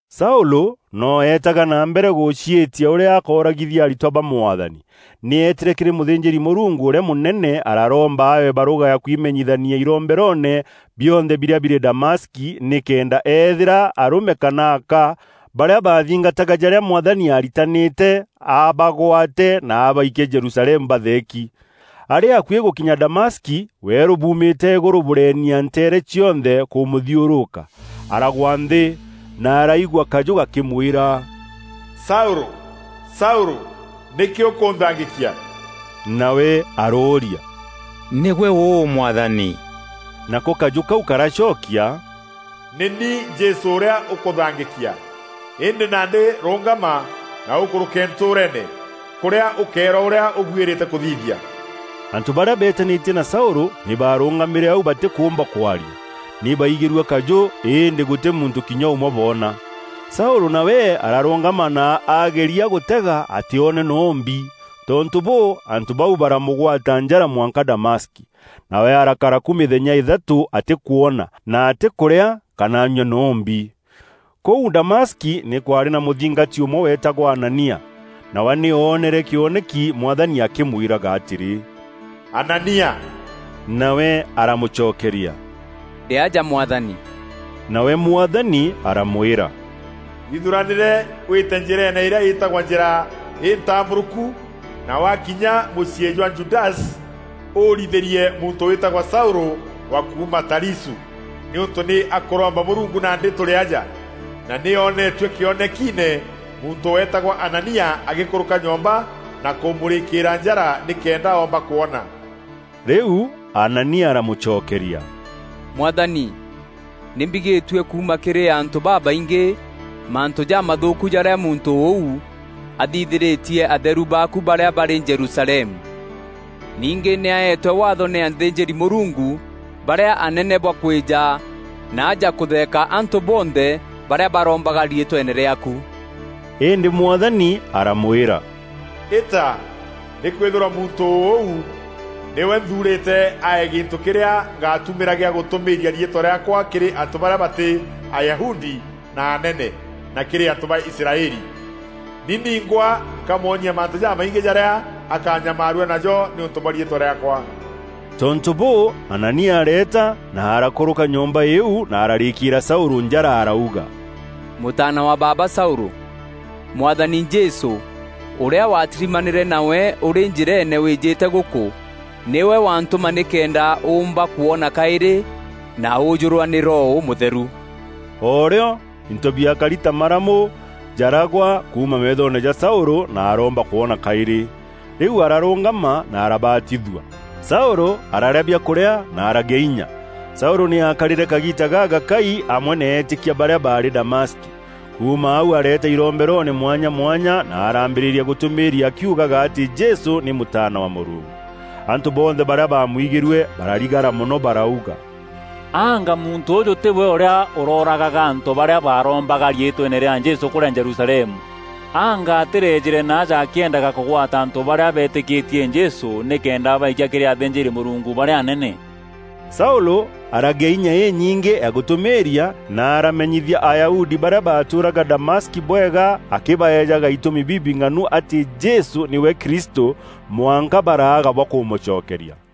Saûlû noo eetaga na mbere gûciîtia ûrîa akooragithia aritwa ba Mwathani. Nî eetîre kîrî mûthînjîri-Mûrungu ûrîa mûnene araromba aewe barûga ya kwimenyithania iromberoone bionthe birîa birî Damaski, nîkenda eethîîra arûme kana aka barîa baathingataga jarîa Mwathani aritanîte, abagwate na abaikie Jerusalemu batheeki. Arî akuî gûkinya Damaski, weerû buumîte îgûrû bûrenia nteere cionthe kûmûthiûrûka. Aragwa nthî, na araigua kajû gakîmwîra: “Saûlû, Saûlû! Nîkî ûkûnthangîkia?” Nawe arooria, “Nîgwe ûû Mwathani?” Nako kajû kau karacokia, “Nî ni Jesû ûrîa ûkûthangîkia. Îndî nandî rûngama, na ûkûrûke ntûûreene, kûrîa ûkeerwa ûrîa ûbuîrîte kûthithia.” Antû barîa beetanîtie na Saûlû nî barûngamîre au batîkûûmba kwaria. Nî baaigîrue kajû, îndî gûtî muntû kinya ûmwe boona. Saûlû nawe ararûngama na ageria gûtega, atîoone noo mbi. Tontû bûû, antû bau baramûgwata njara mwanka Damaski. Nawe arakara ku mîthenya îthatû atîkwona, na atîkûrîa kana anyua noo mbi. Kûu Damaski nî kwaarî na mûthingati ûmwe weetagwa Anania. Nawe nî oonere kîoneki Mwathani akîmwîraga atîrî, “Anania!” Nawe aramûcokeria, “Ndî aja Mwathani.” Nawe Mwathani aramwîra, “Ithuranîre wîte njîreene îrîa îtagwa Njîra întambûrûku na waakinya mûciî jwa Judasi, ûrithîrie muntû wîtagwa Saûlû wa kuuma Tarisû, nîûntû nî akûromba Mûrungu nandî tûrî aja, na nî onetue kîonekiine muntû weetagwa Anania agîkûrûka nyomba na kûmûrîkîîra njara nîkenda oomba kwona.” Rîu Anania aramûcokeria, “Mwathani, nî mbigîtue kuuma kîrî antû babaingî mantû jamathûûku jarîa muntû ûu athithîrîtie atheru baaku barîa barî Jerusalemu. Ningî nî aetwe waatho nî athînjîri-Mûrungu barîa anene bwa kwîja naaja kûtheeka antû bonthe barîa barombaga riîtweene rîaaku.” Îndî Mwathani aramwîra, “Îta, nîkwîthîrwa muntû ûu nîwe nthuurîte ae gîntû kîrîa ngaatumîra gîa gûtûmîîria riîtwa rîaakwa kîrî antû barîa batî Ayahudi na anene, na kîrî antû ba Israeli. Ni ningwa nkamwonia mantû jamaingî jarîa akanyamaarua najo nîûntû bwa riîtwa rîaakwa.” Tontû bûû, Anania areeta na arakûrûka nyomba îîu na ararîkîîra Saûlû njara arauga, “Mûtaana wa baaba Saûlû, Mwathani Jesû, ûrîa watirimanîre nawe ûrî njîreene wîîjîte gûkû, nîwe wantûma nîkenda ûûmba kwona kaîrî, na ûûjûrwa nî Roho Ûmûtheru.” O rîo, into biakari ta maramû jaragwa kuuma meethoone ja Saûlû, na aroomba kwona kaîrî. Rîu ararûngama na arabatithua. Saûlû araarîa biakûrîa na aragîa inya. Saûlû nî aakarîre kagiita gagakai amwe na eetîkia barîa baarî Damaski. Kuuma au areeta iromberoone mwanya mwanya na araambîrîria gûtûmîîria akiugaga atî Jesû nî Mûtaana wa Mûrungu. Antû bonthe barîa baamwigîrue bararigara mono barauga, “Anga muntû ûûjû tîwe ûrîa ûroragaga antû barîa barombaga riîtweene rîa Jesû kûrîa Jerusalemu? Anga atîrejîre naaja akîendaga kûgwata antû barîa beetîtîkîtie Jesû nîkenda abaikia kîrî athînjîri-Mûrungu barîa anene?” Saûlû aragîa inya inyingî ya gûtûmîîria, na aramenyithia Ayahudi barîa baatûûraga Damaski bwega, akîbaejaga itûmi bibing'anu atî Jesû nîwe Kristû mwanka baraaga bwa kumûcokeria.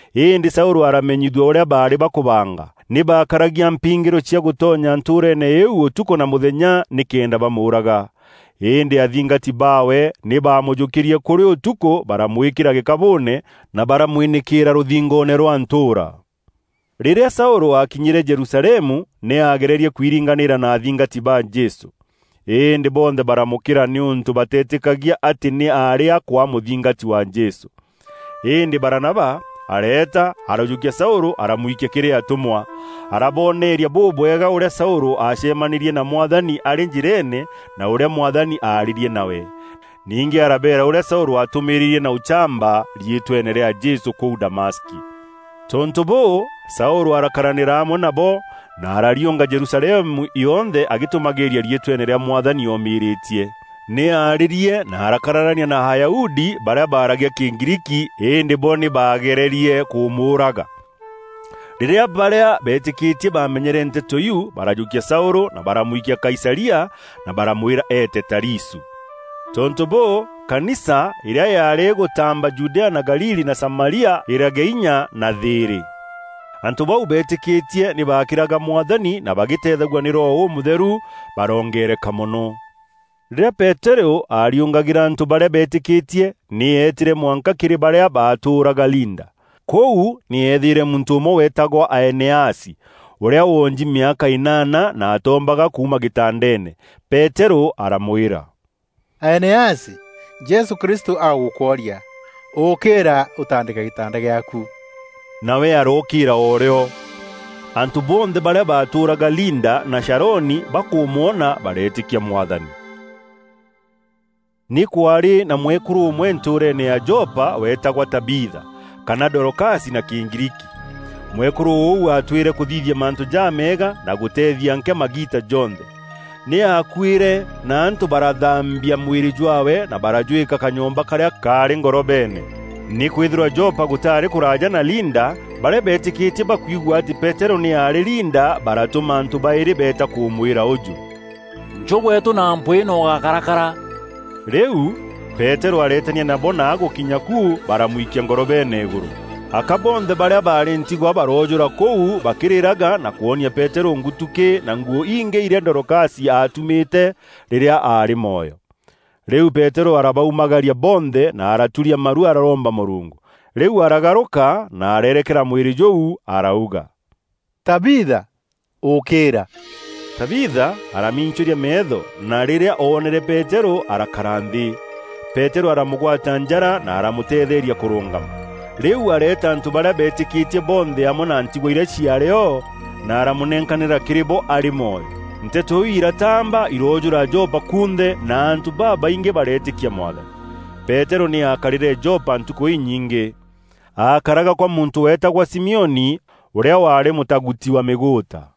îndî Saûlû aramenyithua ûrîa baarî bakûbanga. Nî baakaragia mpingîro cia gûtonya ntûûreene îîu ûtukû na mûthenya nîkenda bamûûraga. Îndî athingati baawe nî baamûjûkîrie kûrî ûtukû baramwîkîra gîkabûûne na baramwînîkîîra rûthingoone rwa ntûûra. Rîrîa Saûlû aakinyîre Jerusalemu, nî aagererie kwiringanîra na athingati ba Jesû. Îndî bonthe baramûkîra, nîûntû bateetîkagia atî nî aarî akwaa mûthingati wa Jesû. Îndî Baranaba areeta arajûkia Saûlû aramwikia kîrî atûmwa, arabooneria bûbwega ûrîa Saûlû aacemanîrie na Mwathani arî njîreene na ûrîa Mwathani aarîrie nawe. Ningî arabeera ûrîa Saûlû aatûmîrîîrie na ûchamba riîtweene rîa Jesû kûu Damaski. Tontû bûû, Saûlû arakaranîra amwe nabo, na arariûnga Jerusalemu yonthe agîtûmagîîria riîtweene rîa Mwathani omîrîtie. Nî aarîrie na arakararania na Ayahudi barîa baaragia Kîgriiki, îndî bo nî baagererie kûmûûraga. Rîrîa barîa beetîkîtie baamenyere nteto iu, barajûkia Saûlû na baramwikia Kaisaria na baramwîra eete Tarisû. Tontû bûû, Kanisa, îrîa yaarî îgûtaamba Judea na Galili na Samaria îragîa inya na thîîrî. Antû bau beetîkîtie nî baakîraga Mwathani na bagîteethagua nî Roho Ûmûtheru, barongeereka mono. Rîrîa Peterû aariûngagîra antû barîa beetîkîtie, nî eetîre mwanka kîrî barîa baatûraga Linda. Kûu nî eethîîre muntû ûmwe weetagwa Aeneasi, ûrîa woonji mîaka înaana na atoombaga kuuma gîtandeene. Peterû aramwîra, “Aeneasi, Jesû Kristû agûkworia. Ûkîîra ûtandîke gîtanda gîaaku.” Nawe arookîîra o rîo. Antû bonthe barîa baatûûraga Linda na Sharoni bakûmwona bareetîkia Mwathani. Nî kwaarî na mwekûrû ûmwe ntûûreene ya Jopa weetagwa Tabiitha kana Dorokasi Dorokasi: nî kuuga Kathia. na Kîgriiki. Mwekûrû ûu aatwîre kûthithia mantû jameega na gûteethia nkîa magiita jonthe. Nî aakuîre na antû barathaambia mwîrî jwaawe na barajwîka kanyomba karîa kaarî ngorobeene. Nîkwîthîrwa Jopa gûtaarî kûraaja na Linda, barîa beetîkîtie bakwigua atî Peterû nî aarî Linda baratûma antû baîrî beeta kûmwîra ûjû, “Njû gweetû na mpwîî na ûgákarakara.” Rîu, Peterû areetania nabo na agûkinya ku baramwikia ngorobeene îgûrû. Aka bonthe barîa baarî ntigwa baroojûra kûu bakîrîraga na kwonia Peterû ngutukî na nguû ingî irîa Dorokasi aatumîte rîrîa aarî mwoyo. Rîu Peterû arabaumagaria bonthe, na araturia maru araromba Mûrungu. Rîu aragarûka na areerekera mwîrî jûu arauga, “Tabiitha, ûkîîra!” Tabiitha aramincûria meetho na rîrîa oonere Peterû arakara nthî. Peterû aramûgwata njara na aramûteetheeria kûrûngama. Rîu areeta antû barîa beetîkîtie bonthe amwe na ntigwa irîa ciaarî o na aramûnenkanîra kîrî bo arî mwoyo. Nteto iu irataamba iroojûra Jopa kunthe, na antû babaingî bareetîkia Mwathani. Peterû nî aakarîre Jopa ntukû inyingî. Aakaraga kwa muntû weetagwa Simioni, ûrîa waarî mûtaguti wa mîgûûta.